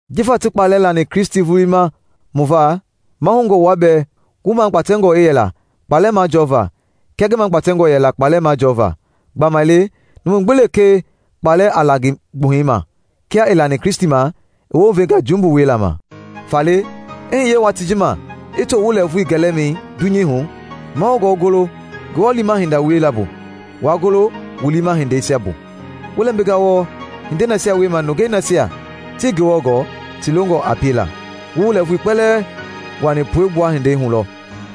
Jifa ti kpaalɛ lani Kristi vulii ma mu va, mahoungɔ wua bɛɛ wu magbatɛngɔ i yɛla kpaalɛ majɔva kia ngi magbatɛngɔ yɛla kpaalɛ majɔva, gbamaile numu gbi lekee kpaalɛ a la ngi gbuhɛi ma kia i lani Kristi ma, i wounvenga jumbu wiela ma. Faale, i hiye watii ji ma i to wu lɛɛvui gɛlɛmɛi dunyei ji hu, mahoungɔ wu golo Ngewɔ liima hindei wiela bu, waa golo wu liima hindeisia bu. Wu lɛmbinga wɔɔ hindei nasia wiema nungei nasia tii Ngewɔ gɔɔ ti longɔ a piela. Wu wu lɛɛvui kpɛlɛɛ wuaani puegbua hindei hu lɔ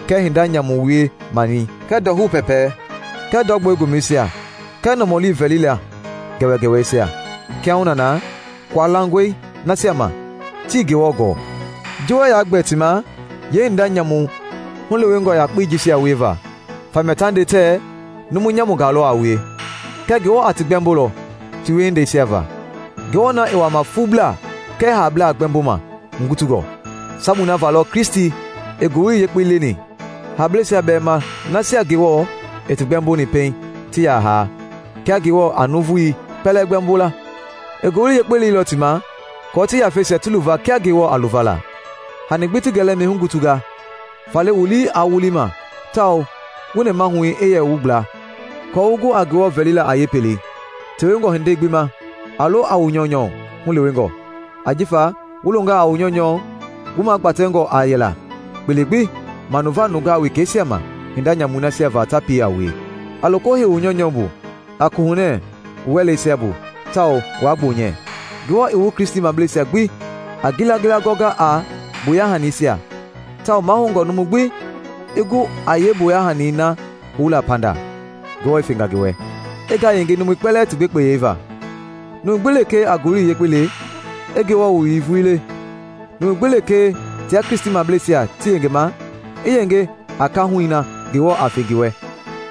kɛɛ hinda nyamu wie-manii kɛɛ ndɔhou pɛɛpɛi kɛɛ ndɔ gbɔle gomɛisia kɛɛ nɔmɔli vɛlila gɛwɛgɛwɛisia. Kiahuna na kualangɔe nasia ma tii Ngewɔ gɔɔ ji wuɛɛ yaa gbɛɛ ti ma yeehinda nyamu hulewengɔ yakpei jisia wieva, famia ta nde tɛɛ numu nyamungaa lɔ a wue. Kɛɛ Ngewɔ a ti gbɛmbolɔ ti wiehindeisia va, Ngewɔ na i wama fuublaa kɛɛ haablaa gbɛmboma hugutungɔ. Sabui na va lɔ Kristi i Ngowili Yekpei leni haablɛisia bɛɛ ma nasia Ngewɔ i ti gbɛmboni pɛiŋ ti yaa haa kia Ngewɔ a nuuvui kpɛlɛɛ gbɛɛmbo la; i Ngowili Yekpei leilɔ ti ma kɔɔ ti yafeisia ti luva kia Ngewɔ a luvala. Hani gbi ti gɛlɛmɛi hugutunga; faale wu lii aa wulima tawao wu nɛmahui i yɛ wu gbla aako wu gu a Ngewɔ vɛlila a yeepelei. Tewengɔ hindei gbi ma, a lo a wu nyɔunyɔ hulewengɔ, ajifa wu longaa a wu nyɔunyɔ, wu magbatɛngɔ a yɛla kpele gbi manuva nungaa wekɛisia ma hinda nyamui nasia va ta pie a wue. A loko hei wu nyɔunyɔ bu a koohunɛɛ wu wɛleisia bu tawao waa gbonyɛ. Ngewɔ i wu Kristimableisia gbi a ngilangila gɔnga a mboya hanisia tawao mahoungɔ numu gbi i gu a yee mboya hanii na houla pandaa Ngewɔ i fenga ngi wɛ, i ngayenge numui kpɛlɛɛ ti gbekpeyɛi va. Numu gbi lekee a Ngowili Yekpei le, i Ngewɔ Wowili vulii le; numu gbi lekee tia Kristimableisia ti yengema, i yenge a kaahui na Ngewɔ a fe ngi wɛ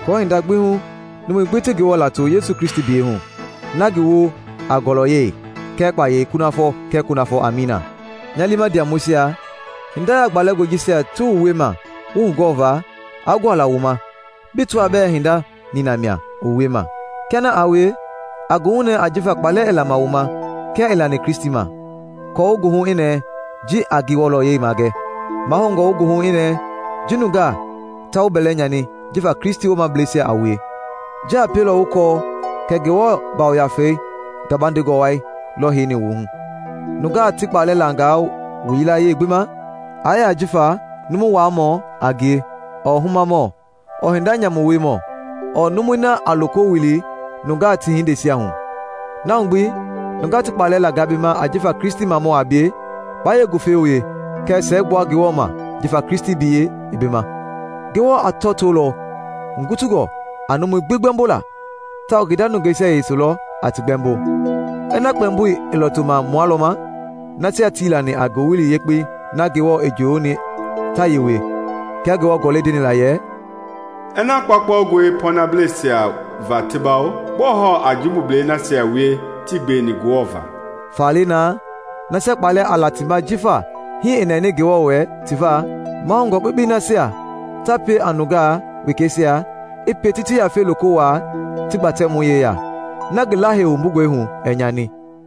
aako hinda gbi hu numui gbi ti Ngewɔ lato Yesu Kristi biyɛi hu, na ngi woo a ngɔlɔyɛi kɛɛ kpayei kunafɔ kɛɛ kunafɔ. Amiina. Nya liima ndiamɔisia, hinda yaagbalɛngɔi jisia ti wu wiema wu hugɔɔva, aa guala wu ma bi tɔaa bɛɛ hinda nina mia i wu wiema. Kia na aa wie, a goohunɛɛ ajifa kpaalɛ i lama wu ma kia i lani Kristi ma, aako wu goohu i nɛɛ ji a ngi wɔlɔyei magɛ. Mahoungɔ wu goohu i nɛɛ ji nungaa ta wu bɛlɛ nyani jifa Kristi woomablɛisia a wue; ji a pielɔ wu kɔɔ kɛ Ngewɔ Yafa gabandengɔ wai lɔ heini wu hu. Nungaa ti kpaalɛ langaa wu yilayee gbi ma, aa yɛ ajifa numu-waamɔ a ngie ɔɔ humamɔ ɔɔ hinda nyamu wiemɔ ɔɔ numui na a loko wili nungaa ti hindeisia hu. Na hu gbi, nungaa ti kpaalɛ langaa bi ma jifa Kristimamɔ a bie, baa yeengufe wie kɛɛ siɛgbua Ngewɔ ma jifa Kristi biyɛi i bi ma. Ngewɔ a tɔɔtolɔ hugungɔ a numui gbi gbɛmbola tawao ngi nda nungeisia yese lɔ a ti gbɛmbo. Ina kpɛmboi i lɔɔtoma mua lɔ ma, nasia tii lani a Ngowili Yekpei na Ngewɔ i njoyoni ta yee wie? Kia Ngewɔ Gɔlɛi ndeni la yɛ, “Ina kpaukpaungɔi pɔɔnableisia va ti bawo, gbɔɔ hɔɔ a jumbublɛi nasia wie tii gbeweni Ngewɔ va?” Faale naa, nasia kpaalɛ a la ti ma jifa hii i nɛni Ngewɔ wɛ ti va, mahoungɔ kpekpei nasia ta pie a nungaa wekɛisia i pie ti ti yafeisia loko wuaa ti Gbatɛmɔi yeya, na ngi Lahei wumbungɔi hu ɛɛ nyani.